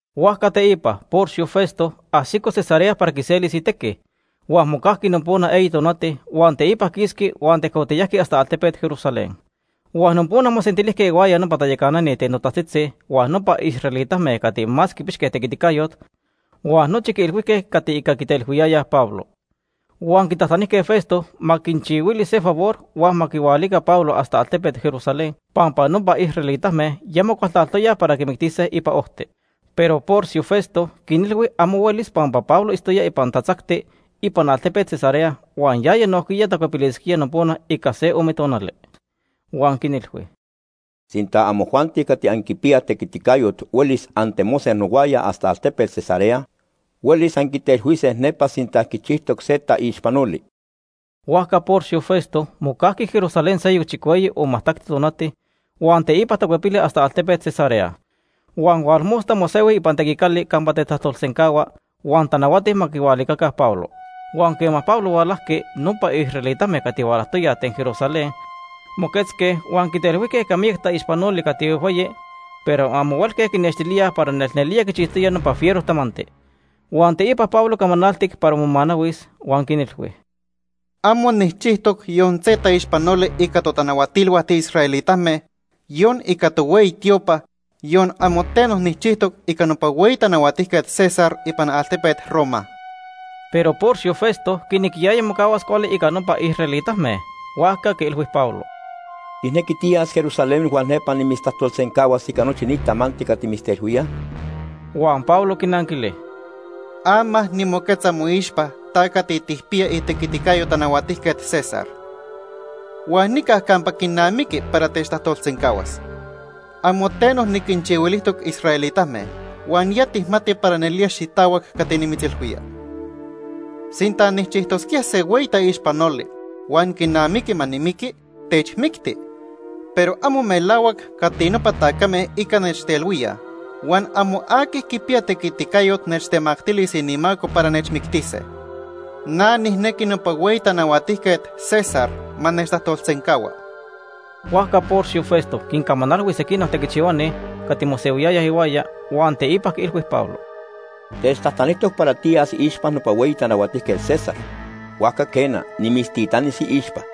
Huajca teipa Porcio Festo ajsico Cesarea para quiselis itequi, huan mocajqui nopona eyi tonati, huan teipa quisqui huan tejcotiyajqui hasta altepet Jerusalén. Huan nopona mosentilijque ihuaya nopa tayacanani ten totajtzitzi huan nopa israelitame cati más quipixque tequiticayot, huan nochi quiilhuijque cati ica quitelhuiyayaj Pablo. Huan quitajtanijque Festo ma quinchihuili se favor huan ma quihualica Pablo hasta altepet Jerusalén pampa nopa israelitame ya mocualtalijtoyaj para quimictisquíaj ipan ojti. Pero Porcio Festo quinilhui amo huelis pampa Pablo itztoya ipan tatzacti ipan altepet Cesarea huan yaya nojquiya tacuepilisquía nopona ica se ome tonali. Huan quinilhui: ―Sinta amojuanti cati anquipiyaj tequiticayot huelis antemose nohuaya hasta altepet Cesarea, huelis anquitelhuise nepa sinta quichijtoc se taixpanoli. Huajca Porcio Festo mocajqui Jerusalén seyoc chicueyi o majtacti tonati huan teipa tacuepili hasta altepe Cesarea. Huan tonili mosehuiyaya ipan tequicali campa tetajtolsencahua huan tanahuati ma quihualicaca Pablo. Huan quema Pablo hualajqui, nopa israelitame cati hualajtoyaj ten Jerusalén moquetzque huan quitelhuijque ica miyac taixpanoli cati huejhueyi, pero amo huelque quinextilíaj para nelnelía quichijtoya nopa fiero tamanti. Huan teipa Pablo camanaltic para momanahuis huan quinilhui: ―Amo nijchijtoc yon se taixpanoli ica totanahuatilhua tiisraelitame, yon ica tohueyi tiopa, yon amo teno nijchijtoc ica nopa hueyi tanahuatijquet César ipan altepet Roma. Pero Porcio Festo quinequiyaya mocahuas cuali ica nopa israelitame, huajca quiilhui Pablo: ―¿Tijnequi tiyas Jerusalén huan nepa nimitztajtolsencahuas ica nochi ni tamanti cati mitztelhuíaj? Huan Pablo quinanquili: ―Ama nimoquetza moixpa, ta cati tijpiya itequiticayo Tanahuatijquet César. Huan nica campa quinamiqui para techtajtolsencahuas. Amo teno niquinchihuilijtoc israelitame huan ya tijmati para nelía xitahuac cati nimitzilhuía. Sinta nijchijtosquía se hueyi taixpanoli huan quinamiqui ma nimiqui, techmicti. Pero amo melahuac cati nopa tacame ica nechtelhuíaj huan amo aqui quipiya tequiticayot nechtemactilis inimaco para nechmictise. Na nijnequi nopa hueyi tanahuatijquet, César, ma nechtajtolsencahua. Huajca Porcio Festo quincamanalhui sequinoc tequichihuani cati mosehuiyayaj ihuaya, huan teipa quiilhui Pablo: ―Techtajtanijtoc para tiyas iixpa nopa hueyi tanahuatijquet César, huajca quena, nimitztitanis iixpa.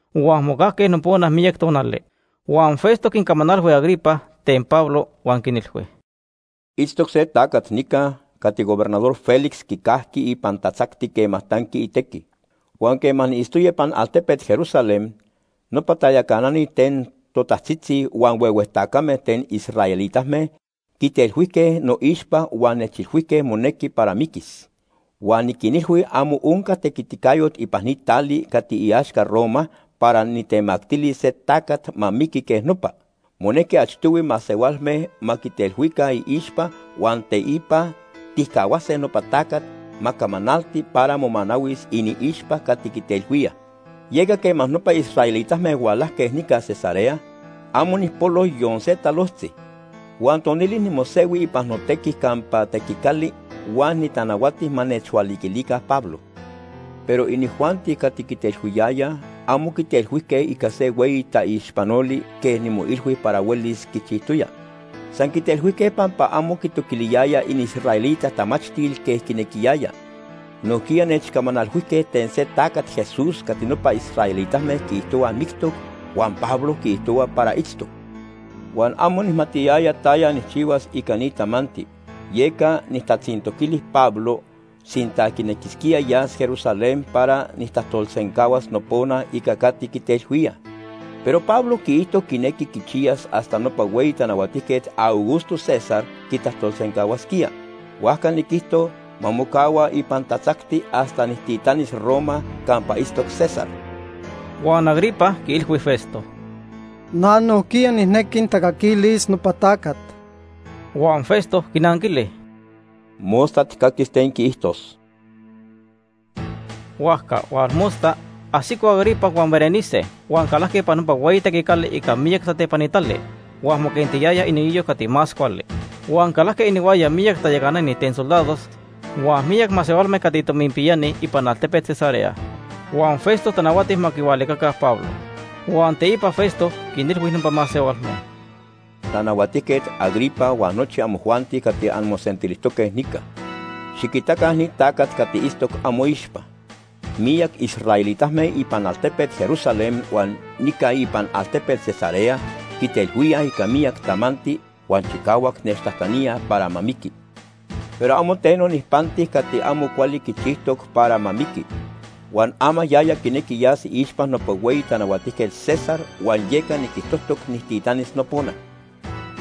Huan mocajque nopona miyac tonali. Huan Festo quicamanalhui Agripa ten Pablo huan quinilhui: ―Itztoc se tacat nica cati Gobernador Félix quicajqui ipan tatzacti quema tanqui itequi. Huan quema niitztoya ipan altepet Jerusalén, nopa tayacanani ten totajtzitzi huan huehue tacame ten israelitame quitelhuijque noixpa huan nechilhuijque monequi para miquis. “Huan niquinilhui amo onca tequiticayot ipan ni tali cati iaxca Roma para nitemactilis se tacat ma miqui quej nopa. Monequi achtohui masehualme ma quitelhuica iixpa huan teipa tijcahuase nopa tacat ma camanalti para momanahuis iniixpa cati quitelhuíaj. Yeca quema nopa israelitame hualajque nica Cesarea, amo nijpolo yon se talojtzi. Huan tonili nimosehui ipan notequi campa tequicali huan nitanahuati ma nechhualiquilica Pablo. Pero inijuanti cati quitelhuiyayaj amo quitelhuijque ica se hueyi taixpanoli quej nimoilhui para huelis quichijtoya. San quitelhuijque pampa amo quitoquiliyaya iniisraelita tamachtil quej quinequiyayaj. Nojquiya nechcamanalhuijque ten se tacat Jesús cati nopa israelitame quiijtohuaj mictoc, huan Pablo quiijtohua para itztoc. Huan amo nijmatiyaya taya nijchihuas ica ni tamanti; yeca nijtatzintoquili Pablo sinta quinequisquía yas Jerusalén para nijtajtolsencahuas nopona ica cati quitelhuíaj. Pero Pablo quiijto quinequi quichiyas hasta nopa hueyi tanahuatijquet Augusto César quitajtolsencahuasquía. Huajca niquijto ma mocahua ipan tatzacti hasta nijtitanis Roma campa itztoc César.” Huan Agripa quiilhui Festo: ―Na nojquiya nijnequi nijtacaquilis nopa tacat. Huan Festo quinanquili: ―Mosta tijcaquis ten quiijtos. Huajca tonili ajsitoj Agripa huan Berenice huan calajque ipan nopa hueyi tequicali ica miyac tatepanitali huan moquentiyayaj iniyoyo cati más cuali. Huan calajque inihuaya miyac tayacanani ten soldados huan miyac masehualme cati tominpiyani ipan altepet Cesarea. Huan Festo tanahuati ma quihualicaca Pablo. Huan teipa Festo quinilhui nopa masehualme: ―Tanahuatijquet Agripa huan nochi amojuanti cati anmosentilijtoque nica, xiquitaca ni tacat cati itztoc amoixpa. Miyac israelitame ipan altepet Jerusalén huan nica ipan altepet Cesarea quitelhuíaj ica miyac tamanti huan chicahuac nechtajtaníaj para ma miqui. Pero amo teno nijpanti cati amo cuali quichijtoc para ma miqui, huan ama yaya quinequi yas iixpa nopa hueyi tanahuatijquet César huan yeca niquijtojtoc nijtitanis nopona.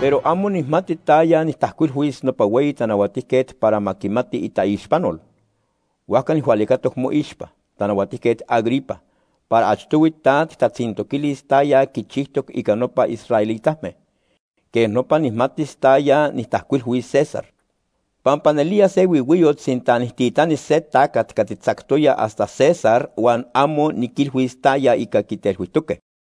Pero amo nijmati taya nijtajcuilhuis nopa hueyi tanahuatijquet para ma quimati itaixpanol. Huajca nijhualicatoc moixpa, Tanahuatijquet Agripa, para achtohui ta tijtatzintoquilis taya quichijtoc ica nopa israelitame. Quej nopa nijmatis taya nijtajcuilhuis César. Pampa nelía se huihuiyot sinta nijtitanis se tacat cati tzactoya hasta César huan amo niquilhuis taya ica quitelhuijtoque.